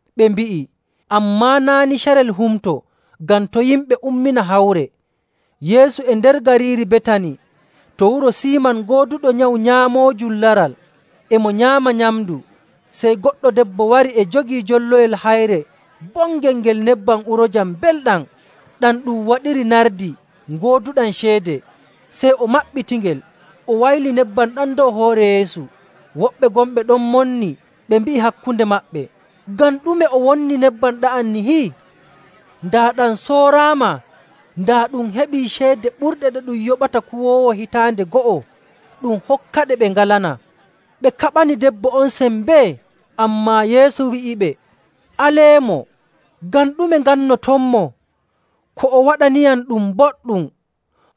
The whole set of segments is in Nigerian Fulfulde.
Ɓe mbi'i, “Ammaa naa' ni carel Humto, ngam to' yimɓe ummina hawre.” Yeesu e nder gariiri Betani to wuro Siiman gooduɗo nyawu nyaamoojum laral. E mo nyaama nyamndu, sey goɗɗo debbo wari e jogii jolloyel hayre bongel ngel nebbam uroojam mbelɗam ɗam ɗum waɗiri nardi gooduɗam ceede. Sey o maɓɓitingel, o wayli nebbam ɗam dow hoore Yeesu.. Woɓɓe gonɓe ɗon ɓe monni ɓe mbi'i hakkunde maɓɓe, “Ngam ɗume o wonni nebbam ɗa'am nihi? Daa ɗam sooraama, daa ɗum heɓii ceede ɓurɗe ɗe ɗum yoɓata kuwoowo hitaande go'o, ɗum hokkaɗe ɓe ngalanaa.” Ɓe kaɓani debbo on sembee. Ammaa Yeesu wi'iɓe, “Aleemo. Ngam ɗume ngannotonmo? Ko o waɗaniyam ɗum boɗɗum.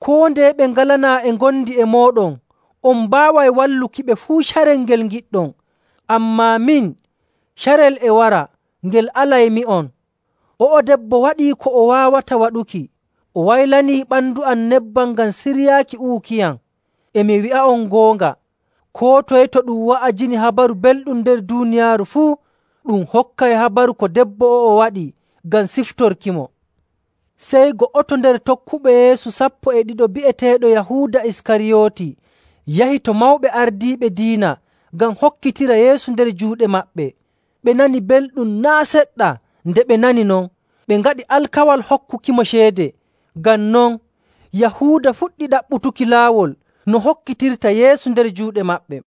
Koo ndeye ɓe ngalanaa e ngondi e mooɗon, on mbaaway wallukiɓe fuu carel ngel ngiɗɗon. Ammaa min, carel e wara ngel alaymi'on.. O'o debbo waɗii ko o waawata waɗuki. O waylanii ɓandu am nebbam ngam siryaaki uwukiyam. E mi wi'a'on goonga, koo toye to ɗum wa'ajini Habaru Belɗum nder duuniyaaru fuu, ɗum hokkay habaru ko debbo o'o waɗi ngam siftorkimo.” Sey go'oto nder tokkuɓe Yeesu sappo e ɗiɗo bi'eteeɗo Yahuuda Iskariyooti yahi to mawɓe ardiiɓe diina ngam hokkitira Yeesu nder juuɗe maɓɓe. Ɓe nani belɗum naa' seɗɗa nde ɓe nani non, ɓe ngaɗi alkawal hokkukimo ceede. Ngam non, Yahuuda fuɗɗi ɗaɓɓutuki laawol no hokkitirta Yeesu nder juuɗe maɓɓe.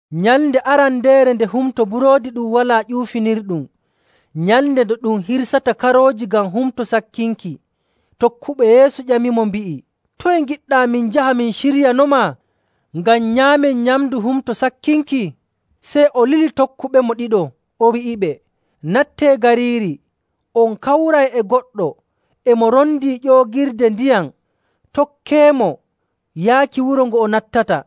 Nyalnde arandeere nde Humto Buroodi Ɗum Walaa Ƴuufinirɗum, nyalnde nde ɗum hirsata karooji ngam Humto Sakkinki, tokkuɓe Yeesu ƴamimo, mbi'i, “Toye ngiɗɗaa min njaha min ciryanomaa ngam nyaamen nyamndu Humto Sakkinki?” Sey o lili tokkuɓemo ɗiɗo, o wi'iɓe, “Nattee gariiri, on kawray e goɗɗo e mo rondii ƴoogirde ndiyam. Tokkeemo yaaki wuro ngo o nattata,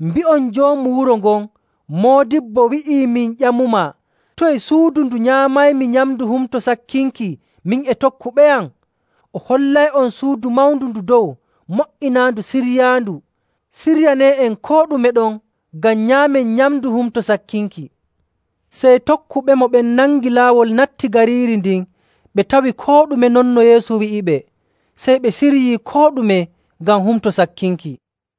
mbi'on joomu wuro ngon, ‘Moodibbo wi'ii min ƴamumaa: Toye suudu ndu nyaamaymi nyamndu Humto Sakkinki, min e tokkuɓeyam?’ O hollay'on suudu mawndu ndu dow mo''inaandu ciryaandu. Ciryanee'en koo ɗume ɗon ngam nyaamen nyamndu Humto Sakkinki.” Sey tokkuɓemo ɓen nangi laawol natti gariiri ndin ɓe tawi koo ɗume non no Yeesu wi'iɓe. Sey ɓe ciryii koo ɗume ngam Humto Sakkinki.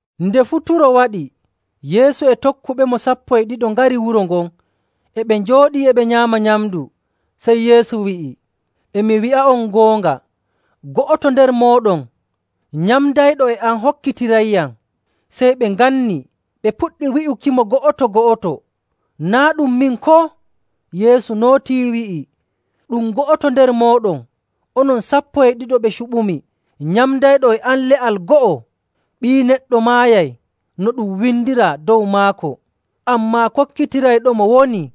Nde futuro waɗi, Yeesu e tokkuɓemo sappo e ɗiɗo ngari wuro ngon. E ɓe njooɗii e ɓe nyaama nyamndu, sey Yeesu wi'i, “E mi wi'a'on goonga, go'oto nder mooɗon nyamndayɗo e am hokkitirayyam.”. Sey ɓe nganni, ɓe puɗɗi wi'ukimo go'oto‑go'oto, “Naa' ɗum min, koo?” Yeesu nootii, wi'i, “Ɗum go'oto nder mooɗon, onon sappo e ɗiɗo ɓe cuɓumi, nyamdayɗo e am le'al go'o. Ɓii Neɗɗo maayay no ɗum windiraa dow maako, ammaa kokkitirayɗomo wonii!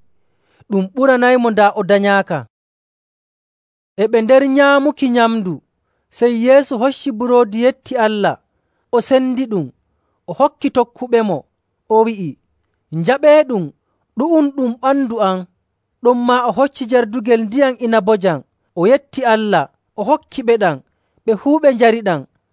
Ɗum ɓuranaymo daa o danyaaka.” E ɓe nder nyaamuki nyamndu, sey Yeesu hocci buroodi yetti Allah, o sendiɗum, o hokki tokkuɓemo, o wi'i, “Njaɓeeɗum. Ɗu'um ɗum ɓandu am.” Ɗonmaa o hocci jardugel ndiyam inabojam, o yetti Allah, o hokkiɓeɗam, ɓe fuu ɓe njariɗam.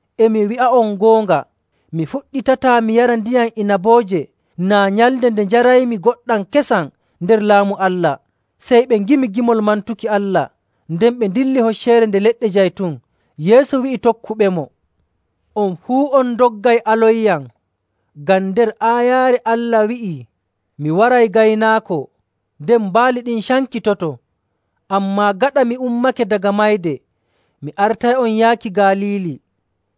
E mi wi'a'on goonga, mi fuɗɗitataa mi yara ndiyam inabooje naa nyalnde nde njaraymi ngoɗɗam kesam nder Laamu Allah.” Sey ɓe ngimi gimol mantuki Allah, nden ɓe ndilli Hocceere Nde Leɗɗe Jaytun. Yeesu wi'i tokkuɓemo, “On fuu on ndoggay alonyam, ngam nder aayaare Allah wi'ii, ‘Mi waray gaynaako, nden baali ɗin cankitoto.’. Ammaa gaɗa mi ummake daga mayde, mi artay'on yaaki Galiili.”.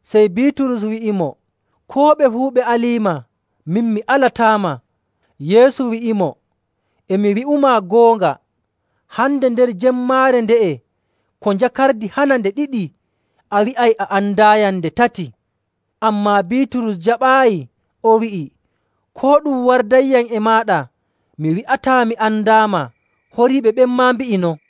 Sey Biiturus wi'imo, “Koo ɓe fuu ɓe aliima, min mi alataama.” Yeesu wi'imo, “E mi wi'umaa goonga, hande, nder jemmaare nde'e, ko njakardi hana nde ɗiɗi, a wi'ay a andaayam nde tati.” Ammaa Biiturus jaɓaayi, o wi'i, “Koo ɗum wardayyam e maaɗa, mi wi'ataa mi andaama.” Horiiɓe ɓen maa mbi'i non.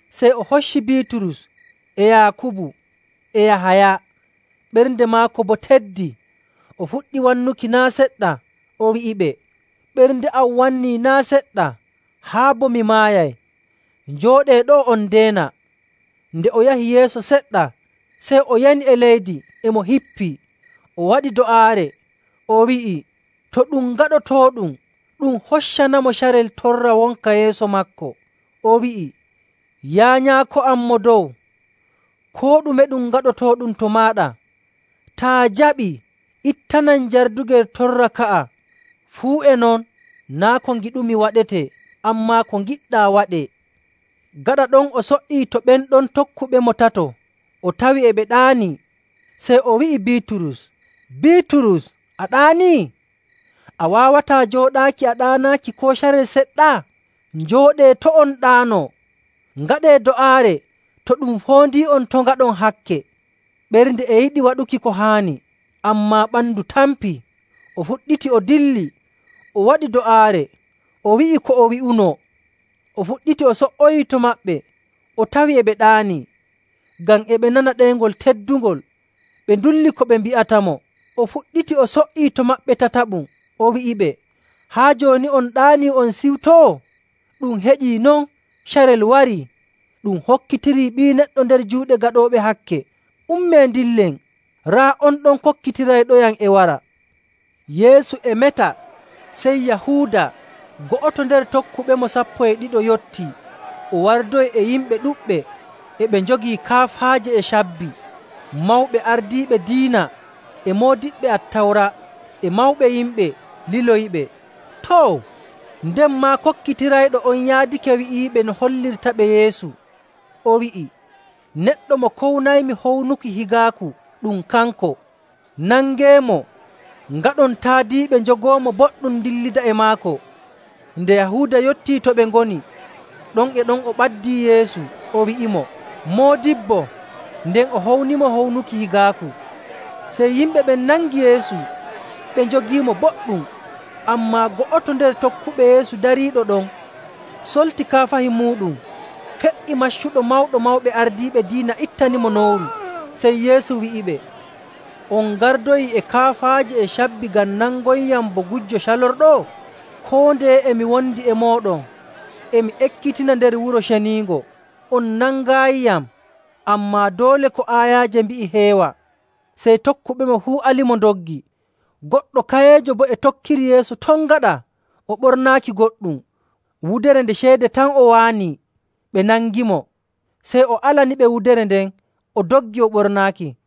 Sey o hocci Biiturus, e Yaakubu, e Yahaya. Ɓernde maako boo teddi, o fuɗɗi wannuki naa' seɗɗa. O wi'iɓe, “Ɓernde am wannii naa' seɗɗa haa bo mi maayay. Njooɗee ɗo'o on ndeena.” Nde o yahi yeeso seɗɗa, sey o yani e leydi e mo hippii, o waɗi do'aare, o wi'i to ɗum gaɗotooɗum ɗum hoccanamo carel torra wonka yeeso maako. O wi'i, “Yaa Nyaako am Mo Dow, koo ɗume ɗum gaɗotooɗum to maaɗa. Taa jaɓii, ittanam jardugel torra ka'a. Fuu e non naa' ko ngiɗumi waɗetee, ammaa ko ngiɗɗaa waɗee.” Gaɗa ɗon o so''ii to ɓen ɗon tokkuɓemo tato, o tawi e ɓe ɗaanii, sey o wi'i Biiturus, “Biiturus, a ɗaanii? A waawataa jooɗaaki a ɗaanaaki koo carel seɗɗa? Njooɗee, to' on ɗaano, ngaɗee do'aare to ɗum foondii'on to' ngaɗon hakke. Ɓernde e yiɗi waɗuki ko haani, ammaa ɓandu tampii.” O fuɗɗiti o dilli, o waɗi do'aare, o wi'i ko o wi'unoo. O fuɗɗiti o so''oyii to maɓɓe, o tawi e ɓe ɗaanii, ngam e ɓe nana ɗeyngol teddungol. Ɓe ndulli ko ɓe mbi'atamo. O fuɗɗiti o so''ii to maɓɓe tataɓum, o wi'iɓe, “Haa jooni on ɗaanii, on ciwtoo? Ɗum heƴii non! Carel warii. Ɗum hokkitirii Ɓii Neɗɗo nder juuɗe gaɗooɓe hakke. Ummee ndillen! Raa on ɗon kokkitirayɗoyam e wara.” Yeesu e meta, sey Yahuuda, go'oto nder tokkuɓemo sappo e ɗiɗo yottii. O wardoyi e yimɓe ɗuɗɓe e ɓe njogii kaafaaje e cabbi. Mawɓe ardiiɓe diina, e moodiɓɓe Attawra, e mawɓe yimɓe liloyiɓe. Too, nden maa kokkitirayɗo on yaadake wi'iiɓe no hollirtaɓe Yeesu, o wi'i, “Neɗɗo mo kownaymi hownuki higaaku ɗum kanko. Nangeemo, ngaɗon taadiiɓe njogoomo boɗɗum ndillida e maako.” Nde Yahuuda yottii to ɓe ngoni, ɗon e ɗon o ɓaddii Yeesu, o wi'imo, “Moodibbo!” nden o hownimo hownuki higaaku. Sey yimɓe ɓen nangi Yeesu ɓe njogiimo boɗɗum. Ammaa go'oto nder tokkuɓe Yeesu dariiɗo ɗon solti kaafahi muuɗum fe''i maccuɗo Mawɗo Mawɓe Ardiiɓe Diina ittanimo nowru. Sey Yeesu wi'iɓe, “On ngardoyi e kaafaaje e cabbi ngam nangoyyam bo gujjo calorɗo? Koo ndeye e mi wondi e mooɗon, e mi ekkitina nder Wuro Ceniingo, on nangaayiyam. Ammaa doole ko aayaaje mbi'i heewa.”. Sey tokkuɓemo fuu alimo ndoggi. Goɗɗo kayeejo boo e tokkiri Yeesu ton gaɗa, o ɓornaaki goɗɗum, wudere nde ceede tan o waanii. Ɓe nangimo, sey o alaniɓe wudere nden, o doggi o ɓornaaki.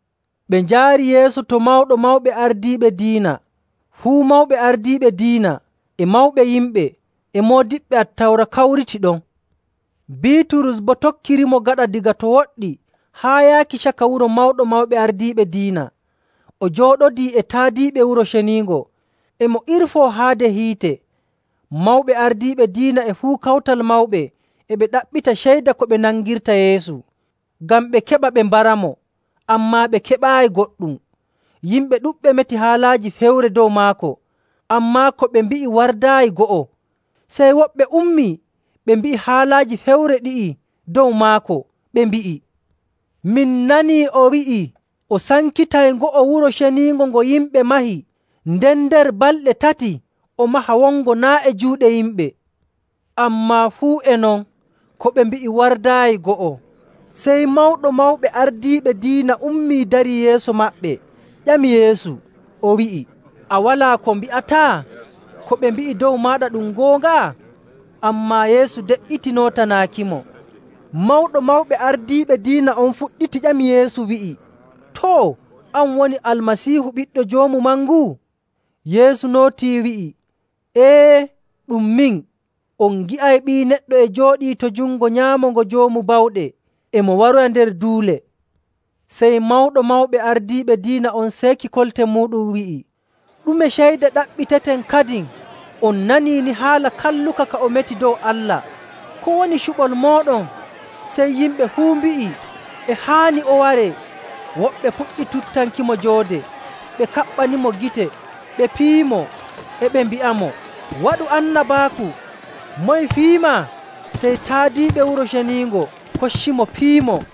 Ɓe njaari Yeesu to Mawɗo Mawɓe Ardiiɓe Diina. Fuu mawɓe ardiiɓe diina, e mawɓe yimɓe, e moodiɓɓe Attawra kawritii ɗon. Biiturus boo tokkirimo gaɗa daga to woɗɗi haa yaaki caka wuro Mawɗo Mawɓe Ardiiɓe Diina. O jooɗodii e taadiiɓe Wuro Ceniingo, e mo irfoo haade hiite. Mawɓe ardiiɓe diina e fuu Kawtal Mawɓe e ɓe ɗaɓɓita ceyda ko ɓe nangirta Yeesu, ngam ɓe keɓa ɓe mbaramo, ammaa ɓe keɓaayi goɗɗum. Yimɓe ɗuɗɓe meti haalaaji fewre dow maako, ammaa ko ɓe mbi'i wardaayi go'o. Sey woɓɓe ummii ɓe mbi'i haalaaji fewre ɗi'i dow maako, ɓe mbi'i, “Min nanii o wi'ii o sankitay ngo'o Wuro Ceniingo ngo yimɓe mahi, nden nder balɗe tati o maha wongo naa' e juuɗe yimɓe.”. Ammaa fuu e non ko ɓe mbi'i wardaayi go'o. Sey Mawɗo Mawɓe Ardiiɓe Diina ummii darii yeeso maɓɓe ƴami Yeesu, o wi'i, “A walaa ko mbi'ataa? Ko ɓe mbi'i dow maaɗa ɗum goonga?” Ammaa Yeesu de''iti nootanaakimo. Mawɗo Mawɓe Ardiiɓe Diina on fuɗɗiti ƴami Yeesu, wi'i, “Too, an woni Almasiihu, Ɓiɗɗo Joomu Mangu?” Yeesu nootii, wi'i, “Ee, ɗum min. On ngi'ay Ɓii Neɗɗo e jooɗii to jungo nyaamo ngo Joomu Bawɗe, e mo waroya nder duule.”. Sey Mawɗo Mawɓe Ardiiɓe Diina on seeki kolte muuɗum wi'i, “Ɗume ceyda ɗaɓɓiteten kadin? On nanii ni haala kalluka ka o meti dow Allah. Ko woni cuɓol mooɗon?” Sey yimɓe fuu mbi'i e haani o waree.. Woɓɓe puɗɗi tuttankimo joode, ɓe kaɓɓanimo gite, ɓe piyimo, e ɓe mbi'amo, “Waɗu annabaaku! Moye fiyimaa?” Sey taadiiɓe Wuro Ceniingo koccimo piyimo.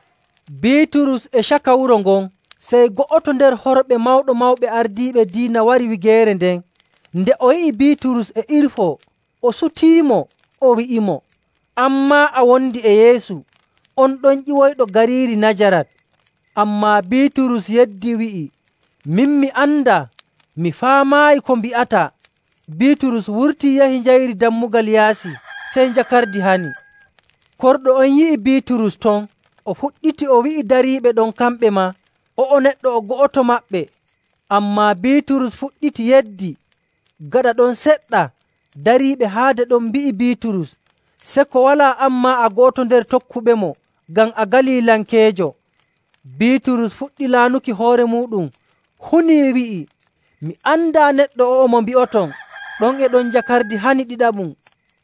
Biiturus e caka wuro ngon, sey go'oto nder horɓe Mawɗo Mawɓe Ardiiɓe Diina wari wigeere nden. Nde o yi'i Biiturus e irfoo, o sutiimo, o wi'imo, “An maa, a wondi e Yeesu on ɗon ƴiwoyɗo gariiri Najarat.” Ammaa Biiturus yeddi wi'i, “Min mi andaa, mi faamaayi ko mbi'ataa.” Biiturus wurtii yahi njayri dammugal yaasi, sey njakardi hani. Korɗo on yi'i Biiturus ton, o fuɗɗiti o wi'i dariiɓe ɗon kamɓe maa, “O'o neɗɗo o go'oto maɓɓe!” Ammaa Biiturus fuɗɗiti yeddi. Gaɗa ɗon seɗɗa, dariiɓe haade ɗon mbi'i Biiturus, “Seko walaa an maa a go'oto nder tokkuɓemo, ngam a Galilankeejo.” Biiturus fuɗɗi laanuki hoore muuɗum hunii wi'i, “Mi andaa neɗɗo o'o mo mbi'oton.” Ɗon e ɗon njakardi hani ɗiɗaɓum.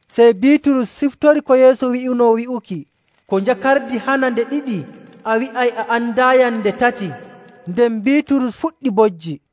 Sey Biiturus siftori ko Yeesu wi'unoomo wi'uki, “Ko njakardi hana nde ɗiɗi, a wi'ay a andaayam nde tati.” Nden Biiturus fuɗɗi bojji.